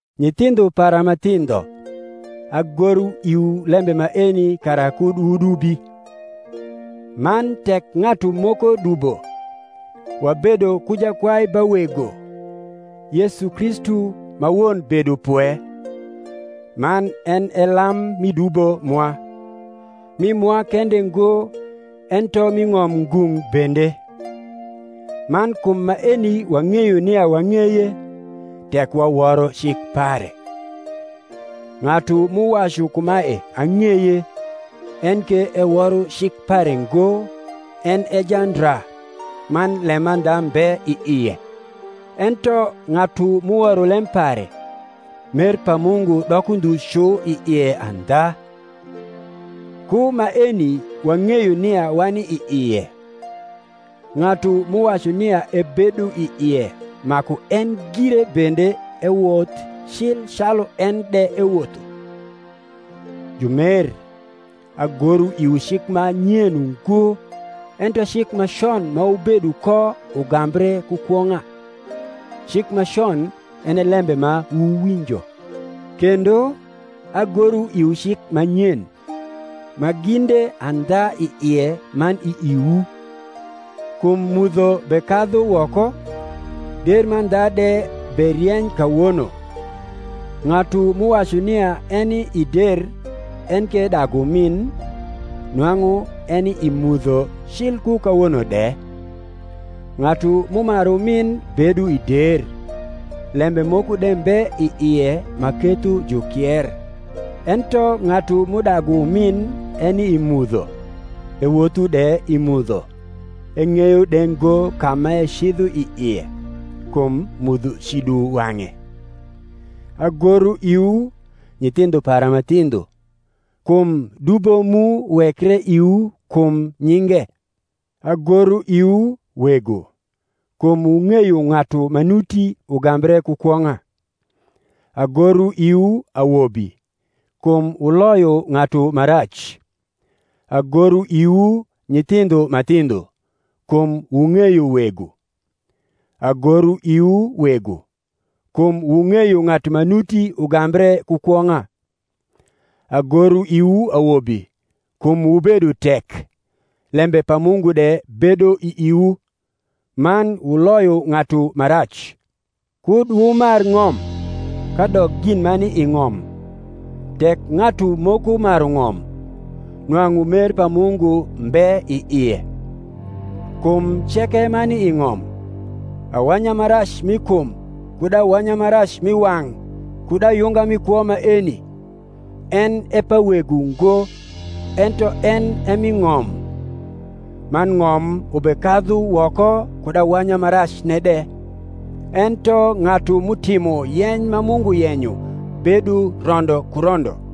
Nyithindho para ma thindho, agoro iwu lembe maeni kara kud wudubi. Man tek ng’atu moko dubo, wabedo ku Jakwai ba Wego, Yesu Kristu ma won bedopwe: man en e lam mi dubo mwa: mi mwa kende ngo, ento mi ng’om ngung’ bende. Man kum maeni wang’eyo nia wang’eye, tek waworo cik pare. Ng’atu m’uwacu kumae, Ang’eye, enke eworo cik pare ngo, en e jandra, man lemandha mbe i ie: ento ng’atu m’uworo lem pare, mer pa Mungu doko ndhu cu i ie andha. Ku maeni wang’eyo nia wani i ie: ng’atu m’uwacu nia ebedo i ie maku en gire bende ewoth cil calu en de ewotho. Jumer, agoro iwu cik ma nyen ungo, ento cik ma con ma wubedo ko ugambre ku kwong’a: cik ma con en e lembe ma wuwinjo. Kendo, agoro iwu cik ma nyen, ma ginde andha i ie man i iwu; kum mudho bekadhu woko, der mandha de berieny kawono. Ng’atu m’uwacu nia eni i der enke edagu umin, nwang’u eni i mudho cil ku kawono de. Ng’atu m’umaru umin bedo i der, lembe moko de mbe i ie ma ketho jukier. Ento ng’atu m’udagu umin eni i mudho, ewotho de i mudho, eng’eyo de ngo ka m’ecidho i ie, kum mudho cido wang’e. Agoro iwu, nyithindho para ma thindho, kum dubo mu wekre iwu kum nyinge. Agoro iwu, wego, kum wung’eyo ng’atu ma nuti ugambre ku kwong’a. Agoro iwu, awobi, kum wuloyo ng’atu ma rac. Agoro iwu, nyithindho ma thindho, kum wung’eyo Wego. Agoro iwu, wego, kum wung’eyo ng’atu ma nuti ugambre ku kwong’a. Agoro iwu, awobi, kum wubedo tek, lembe pa Mungu de bedo i iwu, man wuloyo ng’atu ma rac. Kud wumar ng’om, kadok gin ma ni i ng’om. Tek ng’atu moko maru ng’om, nwang’u mer pa Mungu mbe i ie. Kum ceke ma ni i ng’om, awanya ma rac mi kum kud awanya ma rac mi wang’ kud ayunga mi kwo maeni, en e pa Wego ngo, ento en e mi ng’om. Man ng’om ubekadhu woko kud awanya ma racne de: ento ng’atu m’utimo yeny ma Mungu yenyo bedo rondo ku rondo.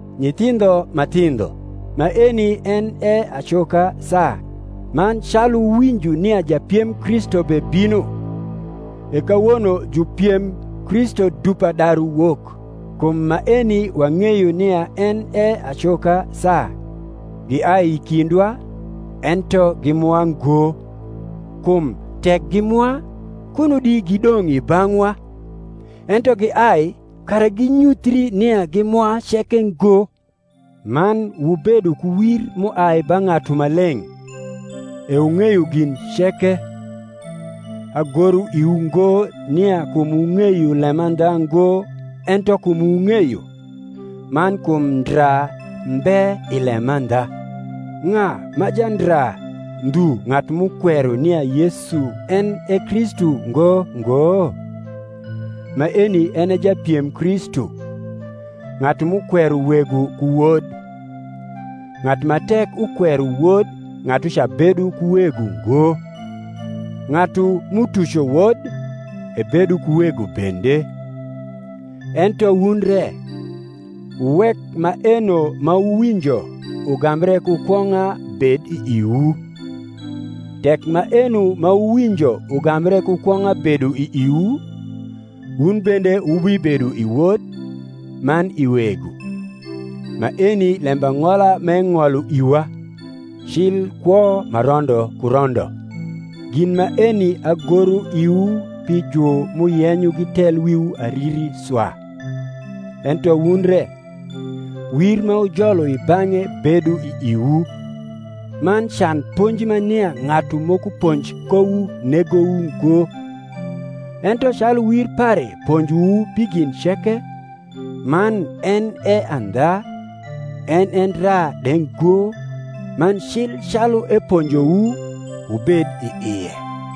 Nyithindho ma thindho, maeni en e acoka saa: man calu wuwinjo nia japiem Kristu bebino, e kawono jupiem Kristu dupa daru wok; kum maeni wang’eyo nia en e acoka saa. Giai i kindwa, ento gi mwa ngo; kum tek gi mwa, kuno di gidong’ i bang’wa: ento giai, kara ginyuthri nia gi mwa ceke ngo. Man wubedo ku wir m’uai ba Ng’atu Maleng’, e wung’eyo gin ceke. Agoro iwu ngo nia kum wung’eyo lemandha ngo ento kum wung’eyo, man kum ndra mbe i lemandha. Ng’a ma jandra ndhu ng’atu m’ukwero nia Yesu en e Kristu ngo ngo? Maeni en e japiem Kristu, ng’atu m’ukwero Wego ku Wod. Ng’atu ma tek ukwero Wod ng’atuca bedo ku Wego ngo: ng’atu m’utuco Wod, ebedo ku Wego bende. Ento wun re, wuwek maeno ma wuwinjo ugambre ku kwong’a bed i iwu. Tek maeno ma wuwinjo ugambre ku kwong’a bedo i iwu, wun bende wubibedo i Wod, man i Wego. Maeni lembang’ola m’eng’olo iwa, cil kwo ma rondo ku rondo. Gin maeni agoro iwu pi ju m’uyenyo gitel wiwu ariri swa. Ento wun re, wir ma wujolo i bang’e bedo i iwu, man can ponji ma nia ng’atu moko ponj kowu negowu ngo; ento calu wir pare ponjowu pi gin ceke, man en e andha, en e ndra de ngo, man cil calu eponjowu, wubed i ie.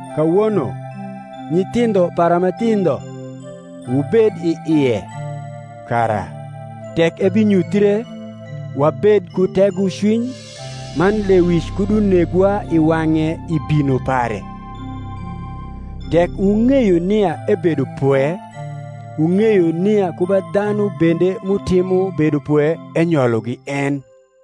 Kawono, nyithindho para ma thindho, wubed i ie; kara, tek ebinyuthre, wabed ku tegocwiny, man lewic kud unegwa i wang’e i bino pare. Tek wung’eyo nia ebedo pwe, wung’eyo nia ku ba dhanu bende m’utimo bedopwe enyologi en.